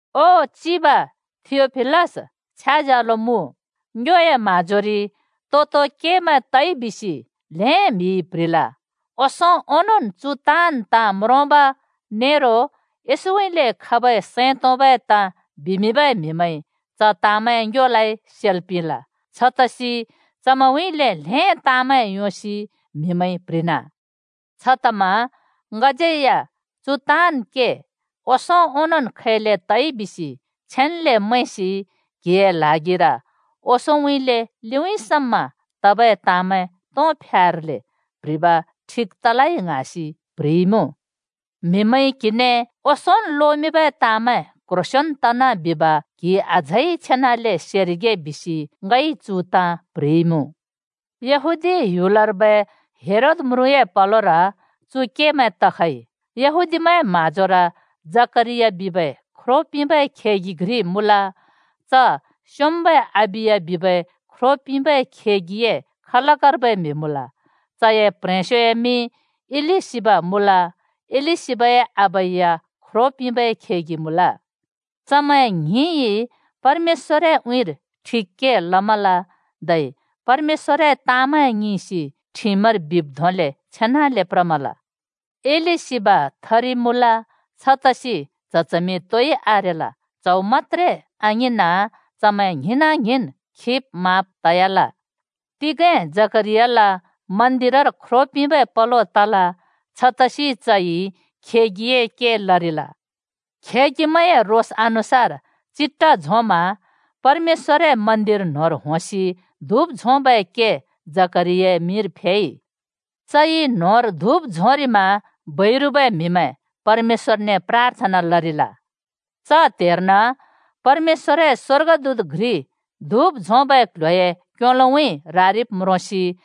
ओ चिब थियोफिलस छ्याज्यालो मुँ! ङ्योए म्‍हाँजोरि तो-तो केमैं तइ बिसि ल्‍हें म्‍हिइ प्‍ह्रिल। ओंसों ओंनोंन् चु ताँन् ताँ म्रोंब नेरो येशूउँइँले खबै सैं तोंबै ताँ बिमिंबै म्‍हिमैंइ च ताँमैं ङ्योलाइ सेल् पिंल। छतसि चमैंउँइँले ल्हें ताँमैं योंसि म्‍हिमैंइ प्‍ह्रिना। छतमा ङज्‍यै या चु ताँन् के ओंसों ओंनोंन् खैले तइ बिसि छेन्‍ले मैंसि क्‍हिए ल्हागिर ओंसोंउँइँले लिउँइँ समा तबै ताँमैं तों फ्यार्ले प्‍ह्रिब ठिक तलै ङ्हाँसि प्ह्रिइमुँ। म्‍हिमैंइ क्हिने ओंसोंन् लोमिंबै ताँमैं क्‍ह्रोंसेंन् तना बिब क्‍हिइ अझै छेनाले सेरिगे बिसि ङइ चु ताँ प्‍ह्रिइमुँ। यहूदीया ह्‍युलर्बै हेरोद म्रुँए पलोर चु केमैं तखइ। यहूदीमैंए म्हाँजोर जकरिया बिबै ख्रो पिंबै खेगि घ्रि मुँल। च स्‍योंम्‍बै अबिया बिबै ख्रो पिंबै खेगिए खलकर्बै म्‍हि मुँल। चए प्ह्रेंस्योए मिं इलिशिबा मुँल। इलिशिबाए आबा या ख्रो पिंबै खेगि मुँल। चमैं ङ्हिंइ परमेश्‍वरए उँइँर ठिक के लमल धै परमेश्‍वरए ताँमैं ङिंसि ठिमर बिब् धोंले छेनाले प्रमल। इलिशिबा थरि मुँल। छतसि च्‍ह-चमिं तोइ आरेल। च्हौ मत्‍त्रे आङिंना, चमैं ङ्हिंना-ङ्हिंन् खिब्‌ माँब् तयाल। तिगें जकरियाल मन्दिरर ख्रो पिंबै पलो तल। छतसि चइ खेगिए के लरिल। खेगिमैंए रोस अनुसार चिट्ठा झोंमा परमेश्‍वरए मन्दिर न्होंर होंसि धुप झोंबै के जकरियाए मिंर फेइ। चइ न्‍होंर धुप झोंरिमा बैरुबै म्हिमैं परमेश्‍वरने प्राथना लरिल। च त्‍हेर्न परमेश्‍वरए स्‍वर्गदूत घ्रि धुप झोंबै क्‍ल्‍ह्‍योए क्‍योलोउँइँ रारिब् म्रोंसि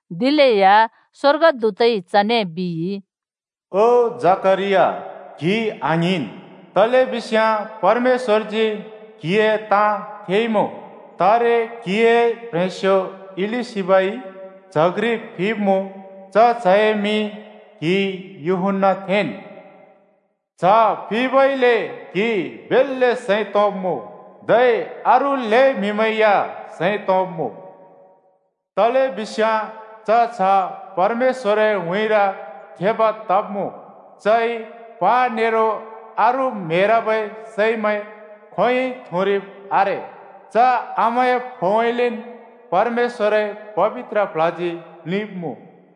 दिलेया स्‍वर्गदूतइ चने बिइ, “ओ जकरिया, क्‍हि आङ्हिंन्! तलेबिस्याँ परमेश्‍वरजी क्‍हिए ताँ थेइमुँ। तारे क्‍हिए प्ह्रेंस्यो इलिशिबाइ च्‍ह घ्रि फिब्‍मुँ, च च्‍हए मिं क्हिइ यूहन्‍ना थेंन्। च्‍ह फिबइले क्‍हि बेल्‍ले सैं तोंब्‍मुँ। धै अरू ल्हें म्‍हिमैं या सैं तोंब्‍मुँ। तलेबिस्याँ च च्‍ह परमेश्‍वरए उँइँर थेब तब्‍मुँ। चइ प्हा नेरो अरू म्हेरबै सैमैं खोंयोंइ थुँरिब आरे। च आमाए फोउँइँलेन् परमेश्‍वरए पबित्र प्ल्हजी प्लिंब्मुँ।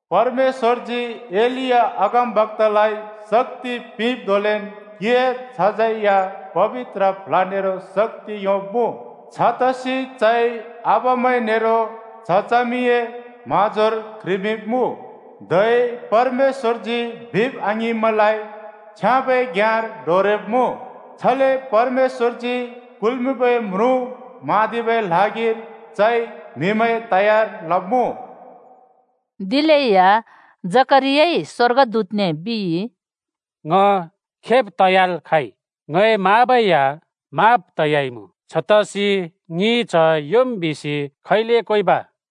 परमेश्‍वरजी एलिया अगमबक्‍तालाइ शक्‍ति पिंब् धोंलेन्‌ क्‍हिए च्‍हज्यै या पबित्र प्ल्ह नेरो शक्‍ति योंब्‍मुँ। छतसि चइ आबामैं नेरो च्‍ह-चमिए म्हाँजोर क्ह्रिमिंब्‍मुँ, धै परमेश्‍वरजी बिब् आङिंब्‍मैंलाइ छ्याँबै घ्‍याँर डोरेब्मुँ। छले परमेश्‍वरजी कुल्‍मिंबै म्रुँ म्हाँदिबै ल्हागिर चइ म्‍हिमैं तयार लब्‍मुँ।” दिलेया जकरियाइ स्‍वर्गदूतने बिइ, “ङ खेब् तयाल् खाँइ, ङए माँबै या माँब् तयाइमुँ। छतसि ङिइ च्‍ह योंम् बिसि खैले क्‍वेंब?”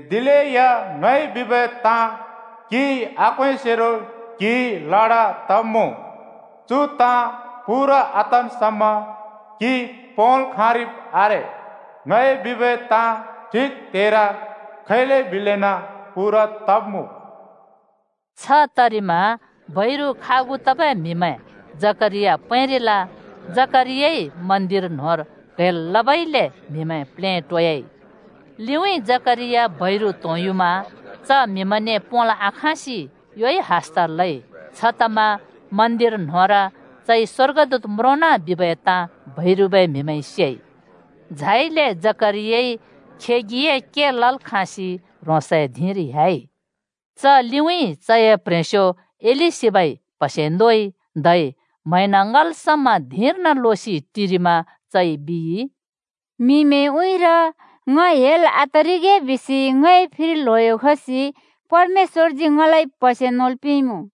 दिलेया ङइ बिबै ताँ क्हिइ आक्‍वेंसेरो क्हि लडा तब्मुँ। चु ताँ पूरा आतन् समा क्‍हि पोंल् खाँरिब् आरे। ङइ बिबै ताँ ठिक त्‍हेर खैले बिलेना पूरा तब्‍मुँ।” छ तरिमा बैरु खागु तबै म्‍हिमैं जकरिया पैंरिल। जकरियाइ मन्दिर न्होंर क्हैल् लबइले म्हिमैं प्लेटोयाल। लिउँइँ जकरिया बैरु त्‍होंयुमा च म्हिमैंने पोंल् आखाँसि योइ हस्‍ता लइ। छतमा मन्दिर न्‍होंर चइ स्‍वर्गदूत म्रोंना बिबै ताँ बैरुबै म्‍हिमैंइ सेइ। झाइले जकरियाइ खेगिए के लल् खाँसि ह्रोंसए धिंर ह्‍याइ। च लिउँइँ चए प्ह्रेंस्यो इलिशिबाइ प्‍हसे नोइ। धै म्हैंन ङ्‌हल् समा धिंर्न लोसि टिरिमा चइ बिइ, “म्हिमैंए उँइँर ङ हेल् आतरिगे बिसि ङए फिर ल्हयो खसि परमेश्‍वरजी ङलाइ प्हसे नोल् पिंइमुँ।”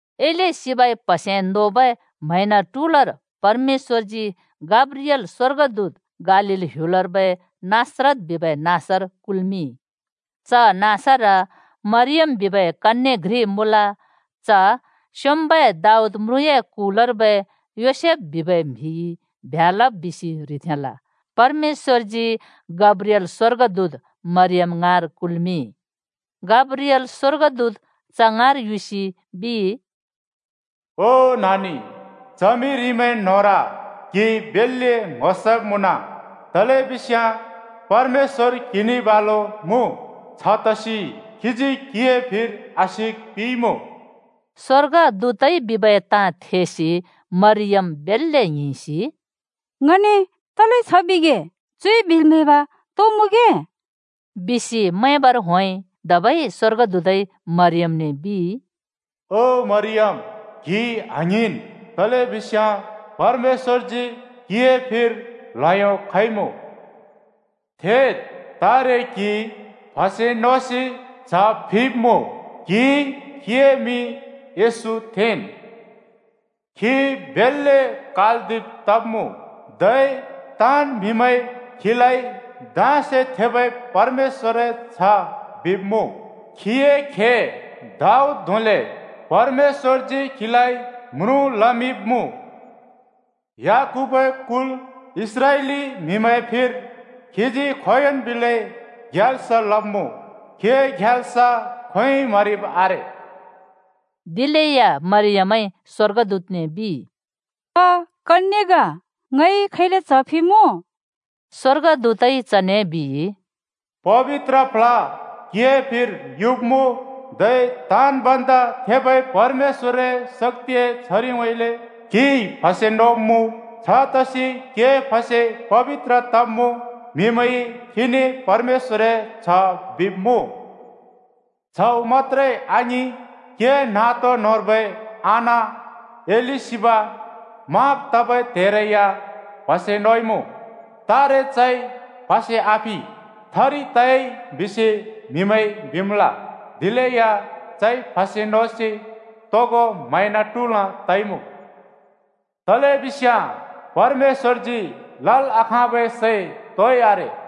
इलिशिबाइ प्‍हसे नोबै म्हैंन ट्हुलर परमेश्‍वरजी गब्रिएल स्‍वर्गदूत गालील ह्‍युलर्बै नासरत बिबै नाँसर कुल्मिंइ। च नाँसर मरियम बिबै कन्‍ये घ्रि मुँल। च स्‍योंम्‍बै दाऊद म्रुँए कुलर्बै योसेफ बिबै म्‍हिइ ब्ह्‍या लब् बिसि ह्रिथेंल। परमेश्‍वरजी गब्रिएल स्वर्गदूत मरियम ङाँर कुल्मिंइ। गब्रिएल स्वर्गदूत च ङाँर युसि बिइ, “ओ नानि, च्हमिरिमैं न्होंर क्हि बेल्‍ले ङ्‍हो सब् मुँन। तलेबिस्याँ परमेश्‍वर क्‍हिने बालु मुँ, छतसि खीजी क्‍हिए फिर आशिक पिंइमुँ।” स्वर्गदूतइ बिबै ताँ थेसि मरियम बेल्‍ले ङ्हिंसि “ङने तले छ बिगे? चुइ बिल् म्हैब तो मुँगे?” बिसि मैंबर होंइ। धबै स्‍वर्गदूतइ मरियमने बिइ, “ओ मरियम, क्हि आङ्हिंन्! तलेबिस्याँ परमेश्‍वरजी क्‍हिए फिर ल्हयो खइमुँ। थेद्! तारे क्‍हिइ प्‍हसे नोसि च्‍ह फिब्‍मुँ। क्हिइ खीए मिं येशू थेंन्। खी बेल्‍ले कालदिब तब्‍मुँ। धै ताँन् म्‍हिमैंइ खीलाइ धाँसे थेबै परमेश्‍वरए च्‍ह बिब्‍मुँ। खीए खे दाऊद धोंले परमेश्‍वरजी खीलाइ म्रुँ लमिंब्‍मुँ। याकूबए कुल इस्राएली म्हिमैंए फिर खीजी खोंयोंन् बिलै ग्याल्स लब्‍मुँ। खीए ग्याल्स खोंयोंइ म्‍हरिब् आरे।” दिलेया मरियमइ स्‍वर्गदूतने बिइ, “ङ कन्‍ये ग। ङइ खैले च्‍ह फिमुँ?” स्‍वर्गदूतइ चने बिइ, “पबित्र प्ल्ह क्‍हिए फिर युब्‍मुँ, धै ताँन् भन्दा थेबै परमेश्‍वरए शक्‍तिए छरिउँइँले क्‍हिइ प्‍हसे नोब्मुँ। छतसि क्‍हिए प्‍हसे पबित्र तब्मुँ, म्‍हिमैंइ खीने परमेश्‍वरए च्‍ह बिब्‍मुँ। च्‍हौ मत्‍त्रे आङिं, क्‍हिए नातो न्होंर्बै आना इलिशिबा माँब् तबै त्हेरै या प्हसे नोइमुँ। तारे चइ प्‍हसे आफि, थरि त‍याइ बिसि म्हिमैंइ बिमल। दिलेया चइ प्‍हसे नोसि तोगो म्हैंन ट्हुल् तइमुँ। तलेबिस्याँ परमेश्‍वरजी लल् आँखाँबै सै तोइ आरे।”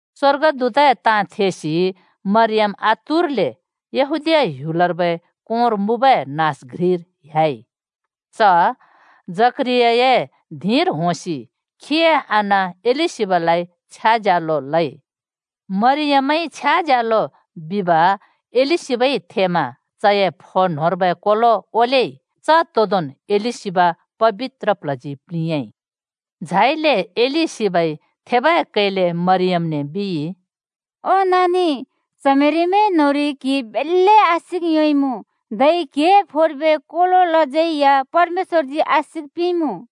स्वर्गदूतए ताँ थेसि मरियम आतुरले यहूदीया ह्‍युलर्बै कोंर मुँबै नाँस घ्रिर ह्‍याइ। च जकरियाए धिंर होंसि खीए आना इलिशिबालाइ छ्याज्यालो लइ। मरियमइ छ्याज्यालो बिब इलिशिबाइ थेमा चए फो न्‍होंर्बै कोलो ओलेइ, च तोदोंन् इलिशिबा पबित्र प्ल्हजी प्लिंयाँइ। झाइले इलिशिबाइ थेबै कैले मरियमने बिइ, “ओ नानि, च्हमिरिमैं न्‍होंरि क्हिइ बेल्‍ले आशिक योंइमुँ, धै क्‍हिए फोर्बै कोलोलाज्यै या परमेश्‍वरजी आशिक पिंइमुँ।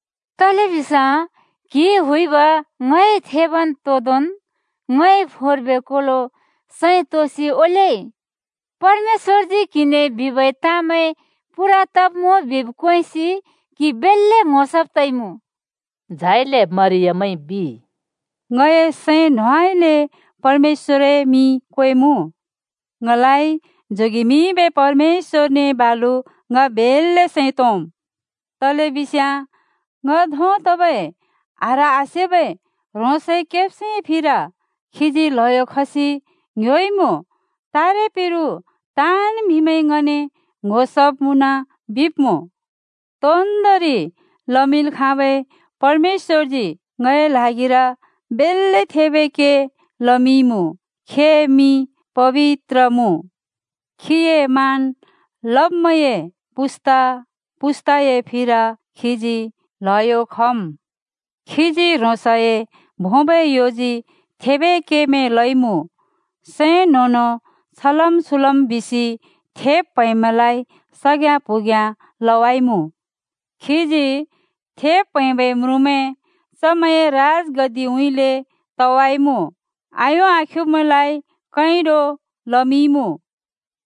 तलेबिस्याँ क्‍हिइ हुइब ङइ थेबै तोदोंन् ङए फोर्बै कोलो सैं तोंसि ओलेइ। परमेश्‍वरजी क्हिने बिबै ताँमैं पूरा तब्‍मुँ बिब् क्वेंसि क्‍हि बेल्‍ले ङ्‍हो सब् तइमुँ।” झाइले मरियमइ बिइ, “ङए सैं न्होंउँइँले परमेश्‍वरए मिं क्‍वेमुँ। ङलाइ जोगेमिंबै परमेश्‍वरने बालु ङ बेल्‍ले सैं तोंम्। तलेबिस्याँ ङ धों तबै आह्र आसेबै ह्रोंसए केब्स्योए फिर खीजी ल्हयो खसि ङ्‍ह्‍योइमुँ, तारे पिरु ताँन् म्‍हिमैंइ ङने ‘ङ्‍हो सब् मुँन,’ बिब्‍मुँ। तोन्‍दोंरि लमिंल् खाँबै परमेश्‍वरजी ङए ल्हागिर बेल्‍ले थेबै के लमिंइमुँ। खीए मिं पबित्र मुँ। खीए मान लब्‍मैंए पुस्‍ता-पुस्‍ताए फिर खीजी ल्हयो खम्। खीजी ह्रोंसए भोंबै योजी थेबै केमैं लइँमुँ, सैं न्हों-न्हों छलम् छुलम् बिसि थेब् प्हैंब्मैंलाइ सग्याँ-प्हुग्याँ लवाइमुँ। खीजी थेब् प्हैंबै म्रुँमैं चमैंए राजगद्दिउँइँले तवाइमुँ, आ‍यों आख्युब्मैंलाइ कैंडो लमिंइमुँ।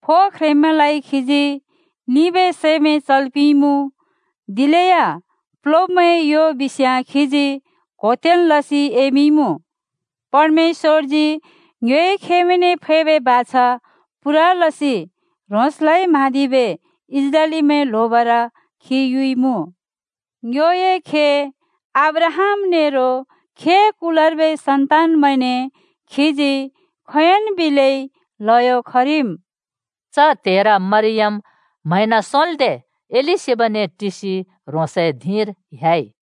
फो ख्रेंब्‍मैंलाइ खीजी लिंबै सैमैं चल् पिंइमुँ, दिलेया प्‍लोब्‍मैंए यो बिस्याँ खीजी क्होतेन् लसि एमिंइमुँ। परमेश्‍वरजी ङ्योए खेमैंने फैबै बाछा पूरा लसि ह्रोंसलाइ म्हाँदिबै इस्राएलीमैं ल्होबर खी युइमुँ। ङ्योए खे अब्राहाम नेरो खीए कुलर्बै सन्तानमैंने खीजी खोंयोंन् बिलै ल्हयो खरिम्।” च त्हेर मरियम म्हैंन सोंल्दे इलिशिबाने टिसि ह्रोंसए धिंर ह्‍याइ।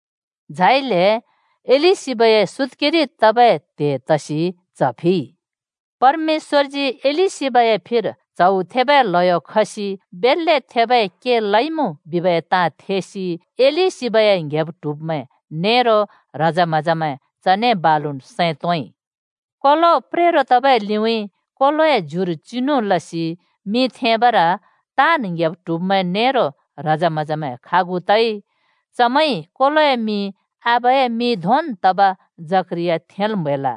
झाइले इलिशिबाए सुत्‍केरि तबै त्‍हे तसि च्‍ह फिइ। परमेश्‍वरजी इलिशिबाए फिर च्हौ थेबै ल्हयो खसि बेल्‍ले थेबै के लइमुँ बिबै ताँ थेसि इलिशिबाए ङ्‌हेब्-ट्हुब्मैं नेरो ह्रजे-म्‍हजेमैं चने बालुन् सैं तोंइ। कोलो प्रेरो तबै लिउँइँ कोलोए ज्युर चिनु लसि मिं थेंबर ताँन् ङ्‍हेब्-ट्हुब्मैं नेरो ह्रजे-म्हजेमैं खागु तइ। चमैंइ कोलोए मिं आबाए मिं धोंन् तब जकरिया थेंल् म्‍हैल।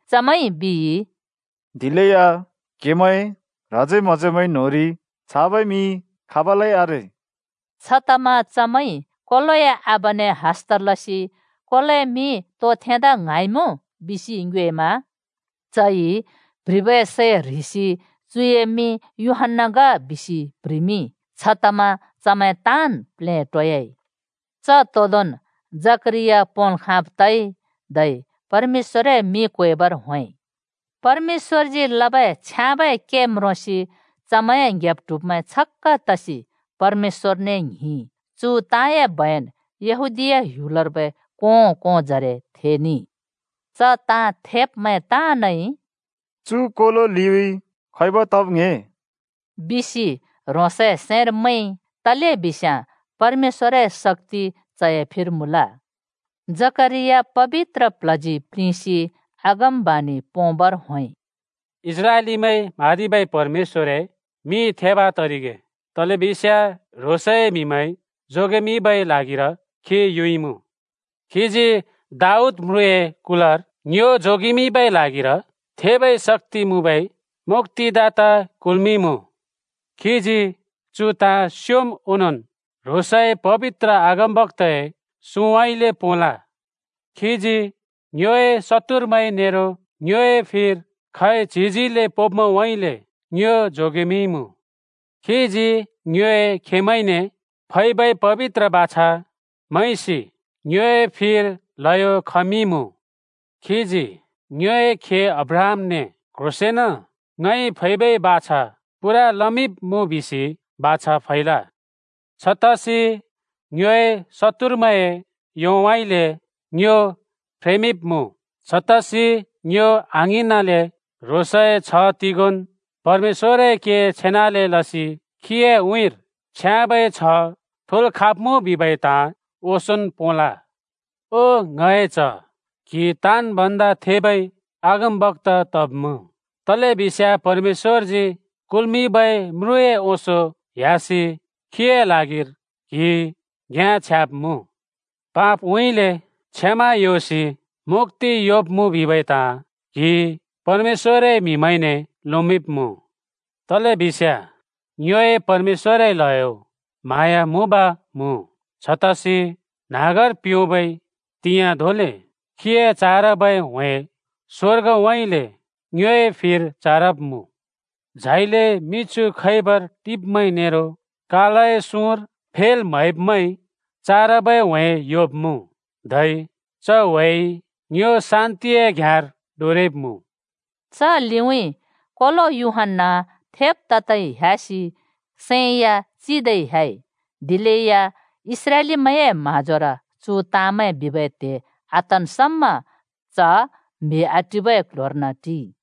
चमैंइ बिइ, “दिलेया क्‍हेमैंए ह्रजे-म्‍हजेमैं न्‍होंरि छाबै मिं खाबलै आरे।” छतमा चमैंइ कोलोए आबाने हस्‍ता लसि “कोलोए मिं तो थेंदा ङ्हाँइमुँ?” बिसि ङ्योएमा चइ प्‍ह्रिबै सै ह्रिसि “चुए मिं यूहन्‍ना ग बिसि” प्ह्रिमिंइ। छतमा चमैं ताँन् प्लेटोयाइ। च तोदोंन् जकरिया पोंल् खाँब् तइ, धै परमेश्‍वरए मिं क्वेंबर होंइ। परमेश्‍वरजी लबै छाबै के म्रोंसि चमैंए ङ्‌हेब्-ट्हुब्मैं छक्‍क तसि परमेश्‍वरने ङ्हिंइ। चु ताँए बयन यहूदीया ह्‍युलर्बै कों-कोंजरे थेनेइ। च ताँ थेब्मैं ताँनइ “चु कोलो लिउँइँ खैब तब् ङ्‍हे?” बिसि ह्रोंसए सैंर मैंइ। तलेबिस्याँ परमेश्‍वरए शक्‍ति चए फिर मुँल। जकरिया पबित्र प्ल्हजी प्लिंसि अगमबाणि पोंबर होंइ, “इस्राएलीमैंइ म्हाँदिबै परमेश्‍वरए मिं थेब तरिगे। तलेबिस्याँ ह्रोंसए म्‍हिमैं जोगेमिंबै ल्हागिर खी युइमुँ। खीजी दाऊद म्रुँए कुलर ङ्यो जोगेमिंबै ल्हागिर थेबै शक्‍ति मुँबै मुक्‍तिदाता कुल्मिंइमुँ। खीजी चु ताँ स्योंम् ओंनोंन् ह्रोंसए पबित्र अगमबक्‍ताए सुँउँइँले पोंल। खीजी ङ्योए शत्तुरमैं नेरो ङ्योए फिर खैच्हिजिले पोंब्‍मैंउँइँले ङ्यो जोगेमिंइमुँ। खीजी ङ्योए खेमैंने फैबै पबित्र बाछा मैंसि ङ्योए फिर ल्हयो खमिंइमुँ। खीजी ङ्योए खे अब्राहामने क्ह्रोंसेंन ङइ फैबै बाछा पूरा लमिंब्मुँ बिसि बाछा फैल। छतसि‍ ङ्योए शत्तुरमैंए योउँइँले ङ्यो फ्रेमिंब्मुँ, छतसि ङ्यो आङ्हिंनाले ह्रोंसए छ्ह तिगोंन् परमेश्‍वरए के छेनाले लसि खीए उँइँर छ्याँबै छ्ह थोल् खाँरिगे बिबै ताँ ओंसोंन् पोंल। ओ ङए च्ह, क्‍हि ताँन् भन्दा थेबै अगमबक्‍ता तब्‍मुँ, तलेबिस्याँ परमेश्‍वरजी कुल्‍मिंबै म्रुँए ओंसों ह्‍यासि खीए ल्हागिर क्‍हिइ घ्‍याँ छ्याब्मुँ। पापउँइँले क्षमा योंसि मुक्‍ति योंब्मुँ बिबै ताँ क्हिइ परमेश्‍वरए म्‍हिमैंने लोमिंब्मुँ। तलेबिस्याँ ङ्योए परमेश्‍वरए ल्हयो म्हाँया मुँब मुँ, छतसि न्हाँगर प्योबै त्हिंयाँ धोंले खीए चारबै ह्‍वे स्वर्गउँइँले ङ्योए फिर चारब्मुँ। झाइले मिछु खैबर टिब्मैं नेरो कालए सुँर फेल् म्हैब्मैंइ चारबै ह्‍वे योंब्मुँ, धै च ह्‍वेइ ङ्यो शान्तिए घ्याँर डोरेब्मुँ।” च लिउँइँ कोलो यूहन्‍ना थेब् तदै ह्‍यासि सैं या चिदै ह्‍याइ। दिलेया इस्राएलीमैंए म्हाँजोर चु ताँमैं बिबै त्हे आतन् समा च म्‍हि आटिबै ‍क्ल्ह्‍योर्न टिइ।